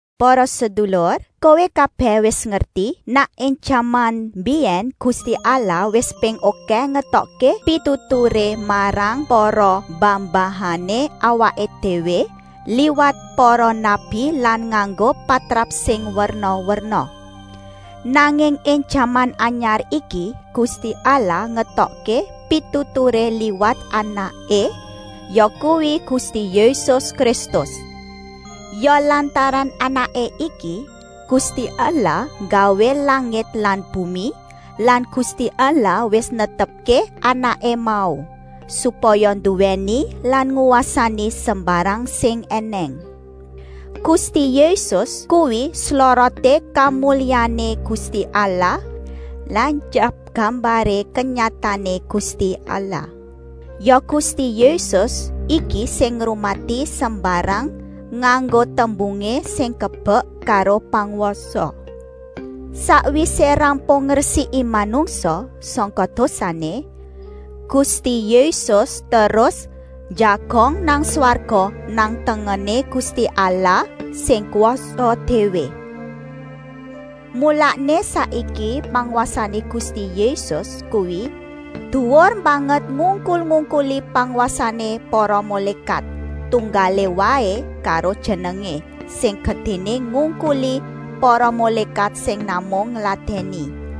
Para sedulur, kowé kabèh wis ngerti nèk ing jaman mbiyèn Gusti Allah wis ping okèh ngetokké pituturé marang para mbah-mbahané awaké déwé liwat para nabi lan nganggo patrap sing werna-werna. Nanging ing jaman anyar iki Gusti Allah ngetokké pituturé liwat Anaké, yakuwi Gusti Yésus Kristus. Ya lantaran Anaké iki Gusti Allah nggawé langit lan bumi lan Gusti Allah wis netepké Anaké mau, supaya nduwèni lan ngwasani sembarang sing ènèng. Gusti Yésus kuwi sloroté kamulyané Gusti Allah lan tyap gambaré kenyataané Gusti Allah. Ya Gusti Yésus iki sing ngrumati sembarang nganggo tembungé sing kebek karo pangwasa. Sakwisé rampung ngresiki manungsa sangka dosané, Gusti Yésus terus njagong nang swarga nang tengené Gusti Allah sing kwasa déwé. Mulané saiki pangwasané Gusti Yésus kuwi duwur banget ngungkul-ungkuli pangwasané para mulékat, tunggalé waé karo Jenengé, sing gedéné ngungkuli para mulékat sing namung ngladèni.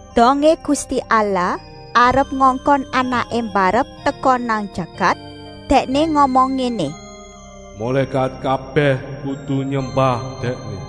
Dongé Gusti Allah arep ngongkon Anaké mbarep teka nang jagat, Dèkné ngomong ngéné: “Mulékat kabèh kudu nyembah Dèkné!”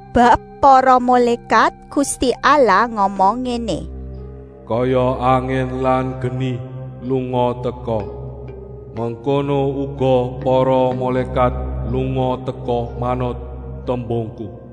Bab para mulékat Gusti Allah ngomong ngéné: “Kaya angin lan geni lunga-teka, mengkono uga para mulékat lunga-teka manut tembungku.”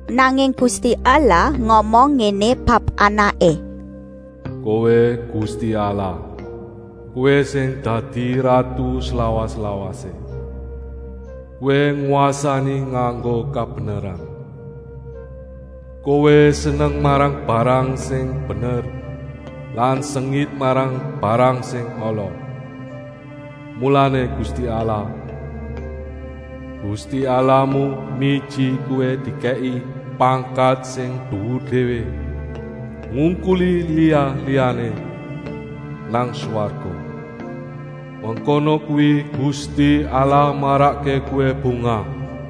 Nanging Gusti Allah ngomong ngéné bab Anaké: “Kowé Gusti Allah, Kowé sing dadi ratu slawas-lawasé. Kowé ngwasani nganggo kabeneran. Kowé seneng marang barang sing bener lan sengit marang barang sing ala. Mulané Gusti Allah, Gusti Allahmu miji Kowé dikèki pangkat sing duwur déwé, ngungkuli liya-liyané nang swarga. Mengkono kuwi Gusti Allah marakké Kowé bungah.”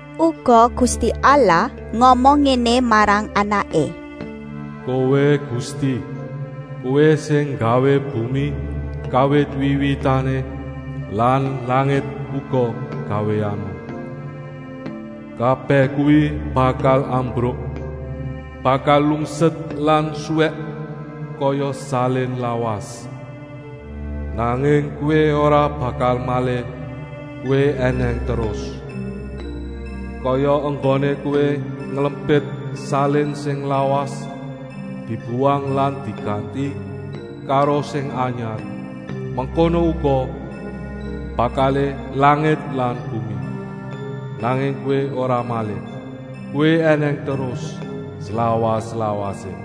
Uga Gusti Allah ngomong ngéné marang Anaké: “Kowé Gusti, Kowé sing nggawé bumi kawit wiwitané lan langit uga gawéanmu. Kabèh kuwi bakal ambruk, bakal lungset lan suwèk kaya salin lawas. Nanging Kowé ora bakal malih, Kowé ènèng terus. Kaya enggoné kowé nglempit salin sing lawas dibuwang lan diganti karo sing anyar, mengkono uga bakalé langit lan bumi. Nanging Kowé ora malih, Kowé ènèng terus, slawas-lawasé.”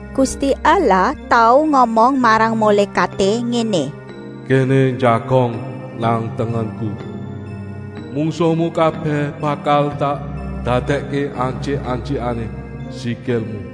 Gusti Allah tau ngomong marang mulékaté ngéné: “Kéné njagong nang tengenku, mungsuhmu kabèh bakal tak dadèkké antyik-antyikané sikilmu.”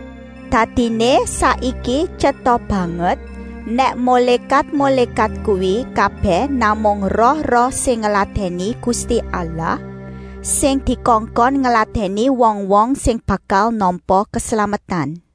Dadiné saiki tyeta banget nèk mulékat-mulékat kuwi kabèh namung roh-roh sing ngladèni Gusti Allah, sing dikongkon ngladèni wong-wong sing bakal nampa keslametan.